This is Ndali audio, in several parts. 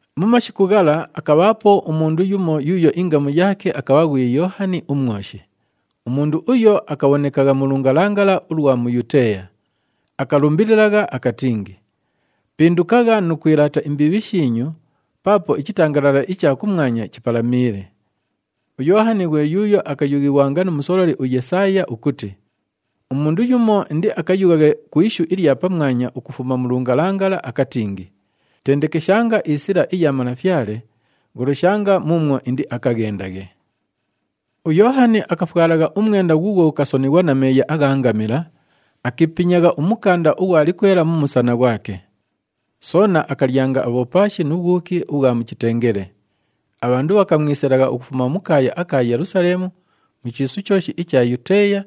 Mu mashiku ghala, akabhaapo umundu yumo yuuyo ingamu yaake akabha ghwi Yoohani uMwoshi. Umundu uyo akabhonekagha mu lungalangala ulwa mu Yuteeya. Akalumbililagha akatingi, “Pindukagha nu kwilaata imbiibhi shiinyu, paapo ichitangalala icha kumwanya chipalamiile.” UYoohani ghwe yuuyo akayughighwanga nu musololi uYesaaya ukuti, “Umundu yumo indiakayughaghe ku ishu ilya pamwanya ukufuma mu lungalangala akatingi, ‘Tendekeshanga isila iya Malafyale, gholoshanga muumwo indiakaghendaghe.’” UYoohani akafwalagha umwenda ghuughwo ghukasonighwa na meeya agha ngamila, akiipinyagha umukanda ughwa likwela mu musana ghwake. Soona akalyanga abhopaashi nu bhwuki ubhwa mu chitengele. Abhandu bhakamwisilagha ukufuma mu kaaya aka Yelusaleemu, mu chiisu chooshi icha Yuteeya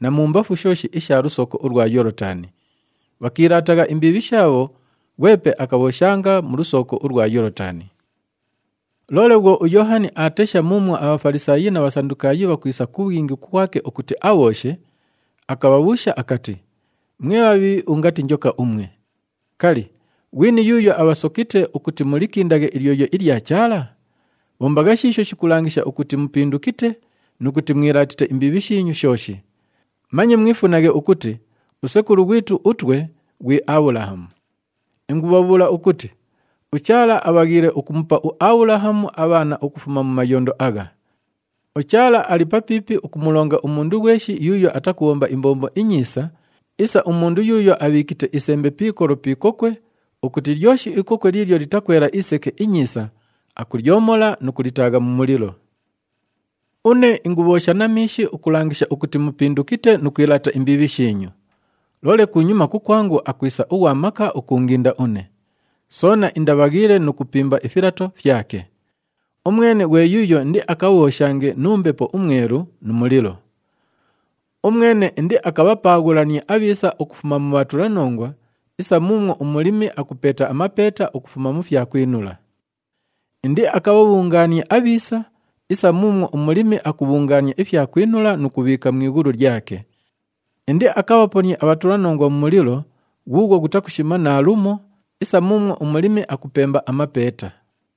na mumbafu shooshi isha lusooko ulwa Yoolotani. Bhakiilaatagha imbiibhi shaabho, ghwepe akabhooshanga mu lusooko ulwa Yoolotani. Loole bhwo uYoohani aatesha muumwo aBhafalisaayi na Bhasandukaayi bhakwisa ku bhwingi kukwake ukuti abhooshe, akabhabhuusha akati, “Mwe bhabhiibhi ungati njoka umwe! Kali, ghwini yuuyo abhasokite ukuti mulikindaghe ilyoyo ilya Chaala? Bhombagha shiisho shikulangisha ukuti mupindukite nu kuti mwilaatite imbiibhi shiinyu shooshi. Manye mwifunaghe ukuti, ‘Usekulu ghwitu utwe ghwi Abhulahamu!’ Ingubhabhuula ukuti uChaala abhaghiile ukumupa uAbhulahamu abhaana ukufuma mu mayondo agha! UChaala ali papiipi ukumulonga umundu ghweshi yuuyo atakubhomba imbombo inyiisa isa umundu yuuyo abhiikite isembe pi ikolo pi ikokwe ukuti lyoshi ikokwe liilyo litakwela iseke inyiisa, akulyomola nu kulitaagha mu mulilo. “Une ingubhoosha na miishi ukulangisha ukuti mupindukite nu kwilaata imbiibhi shiinyu. Loole kunyuma kukwangu akwisa ughwa maka ukuunginda une. Soona indabhaghiile nu kupimba ifilato fyake. Umwene, ghwe yuuyo indiakabhooshange nu Mbepo uMwelu nu mulilo. Umwene indiakabhapaaghulanie abhiisa ukufuma mu bhatulanongwa isa muumwo umulimi akupeeta amapeeta ukufuma mu fyakwinula. Indiakabhabhungaanie abhiisa isa muumwo umulimi akubhungaania ifyakwinula nu kubhiika mu ighulu lyake. Indiakabhaponie abhatulanongwa mu mulilo ghuughwo ghutakushima naalumo isa muumwo umulimi akupemba amapeeta.”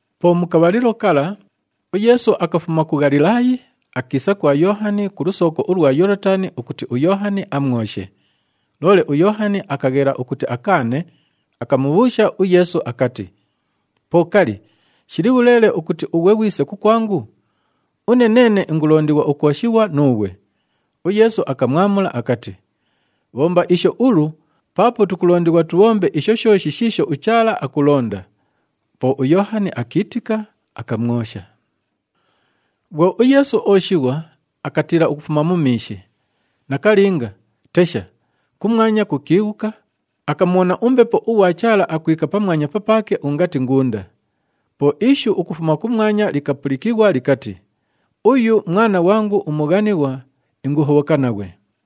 Po mu kabhalilo kala, uYeesu akafuma ku Ghalilaayi, akiisa kwa Yoohani ku lusooko ulwa Yoolotani ukuti uYoohani amwoshe. Loole uYoohani akaghela ukuti akaane, akamubhuusha uYeesu akati, “Po kali, shili bhuleele ukuti ughwe ghwise kukwangu? Une neene ingulondighwa ukwoshighwa nuughwe.” UYeesu akamwamula akati, “Bhomba isho ulu, paapo tukulondighwa tubhombe isho shooshi shiisho uChaala akulonda.” Po uYoohani akiitika, akamwosha. Bhwo uYeesu ooshighwa, akatiila ukufuma mu miishi. Nakalinga, tesha, kumwanya kukiighuka, akamubhona uMbepo ughwa Chaala akwika pamwanya papaake ungati ngunda. Po ishu ukufuma kumwanya likapulikighwa likati, “Uyu Mwana ghwangu umughanighwa, inguhobhoka naghwe.”